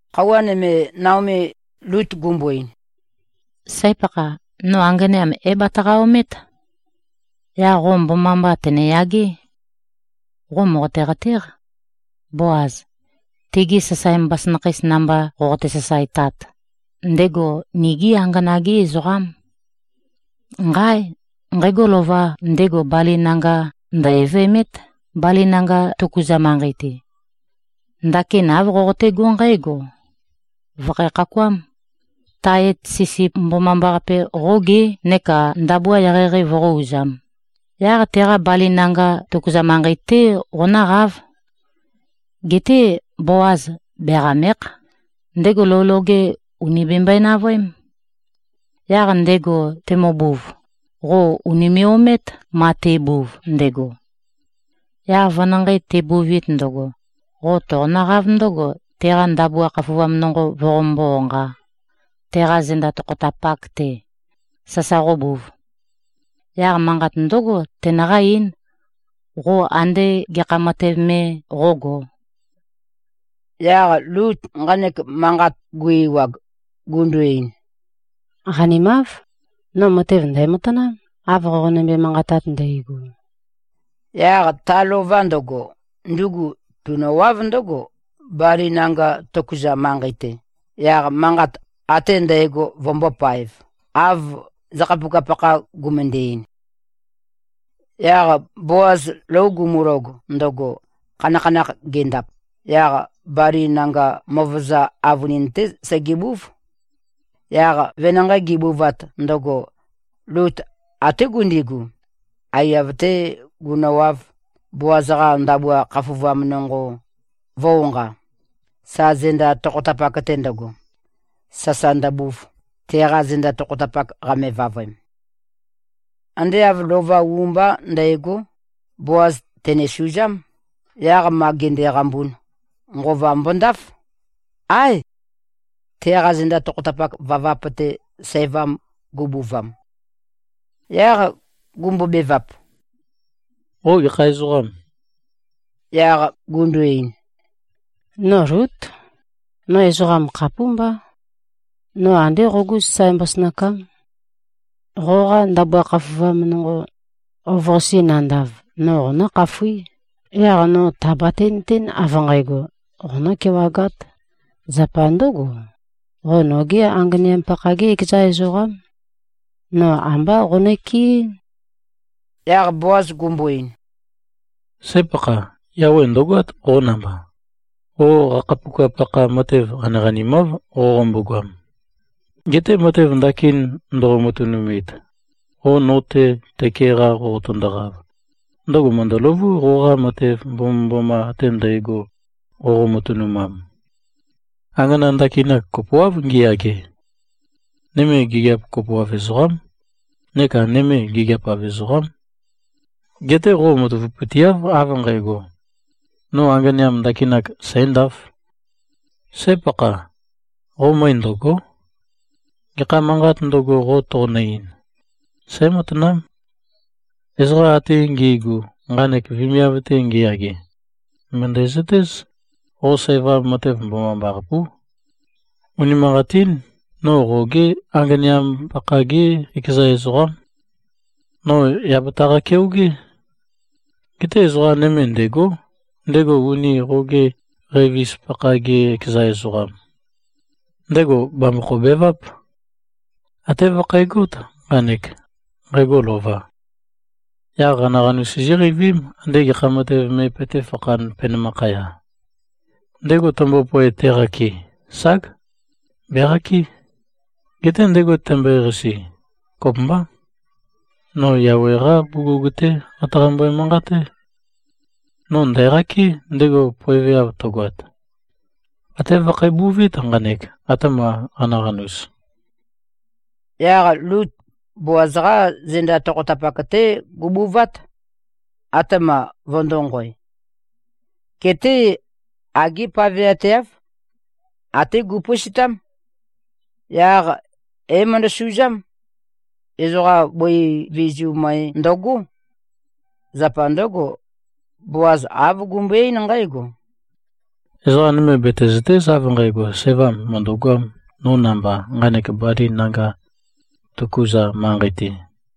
Khøuwa nøme, Naomi Lut gumbo-ein, “Sǽ-pakha. No anganeam é-bataqa-omét. Yaq qo mbomambá tøneyagé. Qo mòqote-qatéq. Boaz, tegi sasae mbasønakheis namba qoqote-sasaetat, ndego nigí angana-gé ezoqám. Nqáe! Nqægo lova ndego bali nanga ndø̀-evemét, bali nanga tøkuza manqei-te. Ndakin āv qoqotégó nqǽgo: Vø̀khæ-khakuám. Tae et sisip mbomambaqape qógé, neka ndabua eqeieqei voqó-uzām. Yaq teqa bali nanga tøkuza manqei-té qonǿqáv. Geté Boaz beqàme᷄kh. Ndego lou loge ùni bembøe-navøém. Yaq ndego temøbuv, qo ùnime꞉-omét, ma te꞉buv ndøgo. Yaq venanqei tebuvit ndøgo, qo toqonǿqáv ndøgo, teqa ndabua khafuvam nonqo voqombó-onqā, teqa zenda tokhotapak-te, sasa qóbūv. Yaq manqat ndǿgo, tenøqá-eín, qo ande gekha matev me qógō.” Yaq Lut nqanek manqat gu-ewag, gundu-ein, “Qanimáv. No matev ndæ̀matanám, av qonømbe-manqatat ndægo.” Yaq ta lova ndøgo, ndugu tunøwáv ndǿgo, bali nanga tøkuza manqei-te, yaq manqat ate ndægo vømbōpaev, av zakhapuka-pakha gumøndæ-ein. Yaq Boaz lou gumulog ndøgo, khanakhanakh gendap, yaq bali nanga møvøza avønin-té segebúv. Yaq venanqei gebuvat ndøgo, Lut até gundigu, aiyav-tē gunøwāv, Boaz-qa ndabua khafuvam nonqo vø̄-onqa, sa zenda tokhotapak-te ndøgo, sasa ndøbuv, teqa zenda tokhotapak qame-vavøem. Ande āv lova u mbá ndægó, Boaz tènesuzám. Yaq ma ge꞉qambun, nqova mbondáf. Áe, teqa zenda tokhotapak vavap-te sævam gubuvam. Yaq gumbobevap, “Qo gekha ezoqâm?” Yaq gundu-ein, “No Lút. No ezoqam khapúmbá. No andé qogú sasae mbasønakám. Qoqa ndabua khafuvam nonqo, ov-qase nandav, no qonǿkhafuí. Yaq no tàbate-nøtén, av nqægo, qonǿ-kewagát. Zapa ndǿgo, qo nogé anganeam-pakha-gé ekeza ezoqám. No ambá qonøkeɨ́n.” Yaq Boaz gumbo-ein, “Sǽ-pakha. Yawe ndø̀goát qo namba. Qo qakhapuka-pakha matev qaniqanimáv qoqombo-goam. Geté matev ndakin ndoqo-matønumit, qo no-te tøke-qa qoqotøndoqav, ndøgo mø̀ndøløvú qoqa matev mbomømboma ate ndægo, qoqo-matønumam. Angana ndakinak kopoáv ngiyage. Nøme gigiap kopoav ezoqám neka nøme gigiap-av ezoqám. Geté qo matavapøteáv av nqægo, ‘No anganeam ndakinak sǣndāf.’ Sǽ-pakha. Qo møe ndø̀go᷄. Gekha manqāt ndøgo, qo toqonø-ein, sǽmatanám. Ezoqa ate ngi꞉gu, nqanek vemiav-te ngiyage, mø̀ndæzøtéz, qo sævam matev mbomambaqapú. Unimanqatín. No qogé anganeam-pakha-gé ekeza ezoqám. No yà bataqa-keogé. Geté ezoqa nøme ndêgó, ndego uni qoge qøivis-pakha-ge ekeza ezoqam. Ndego bàmbokho-beváp. Até vøkhægót nqanek, nqægo lova. Yaq qanaqanus sizíqeivím, andé gekha matev me petéfakhān, penømakhaya. Ndego tømbopoe teqakɨ, ság, beqakɨ́. Geté ndego tømbøeqasi, kopømbá. No Yawe-qá bugug-té qataqambø-manqaté, no ndæ̀qakɨ́, ndego poeveav tøgoat. Até vøkhæbuvít nqanek, atema qanaqanus.” Yaq Lut Boaz-qá zenda tokhotapak-té gubuvát, atema vøndōnqoe. Geté agé paveateáv. Até gupøistám. Yaq é-møndosuzám. Ezoqa bøi vizu møe ndøgó. Zapa ndǿgo, Boaz āv gumbøe-eín nqǽgo, “Ezoqa nøme betezø̀te᷄z av nqægo, sævam mø̀ndøgoām, no namba, nqanek bali nanga tøkuza manqei-te.”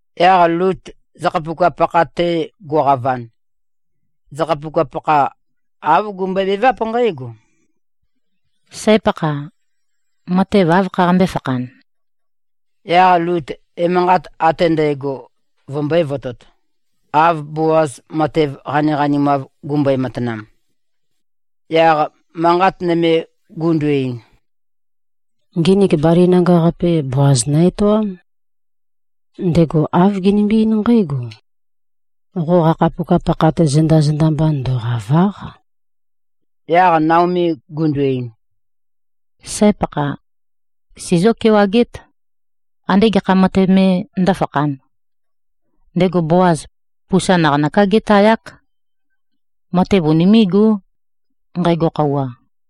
Yaq Lut zakhapuka-pakha-te guqavan, zakhapuka-pakha āv gumbøebeváp nqǽgo, “Sǽ-pakha. Matev áv khaqambé-fakhan?” Yaq Lut emanqat ate ndægo vømbø̄e-votot, av Boaz matev qaniqanimav gumbøe-matanam. Yaq manqat nøme gundu-ein, “Nginik bali nanga-qape Boaz nø-etoám. Ndego āv genømbe-eín nqǽgo, ‘Qo qakhapuka-pakha-te zenda-zenda mba ndøqàva᷄q.’” Yaq Naomi gundu-ein, “Sǽ-pakha. Sizió-kewagét, andé gekha matev me ndǿfakhān. Ndego Boaz pusa naqanøká gétayák. Matev unimé꞉gó, nqægo khøuwa.”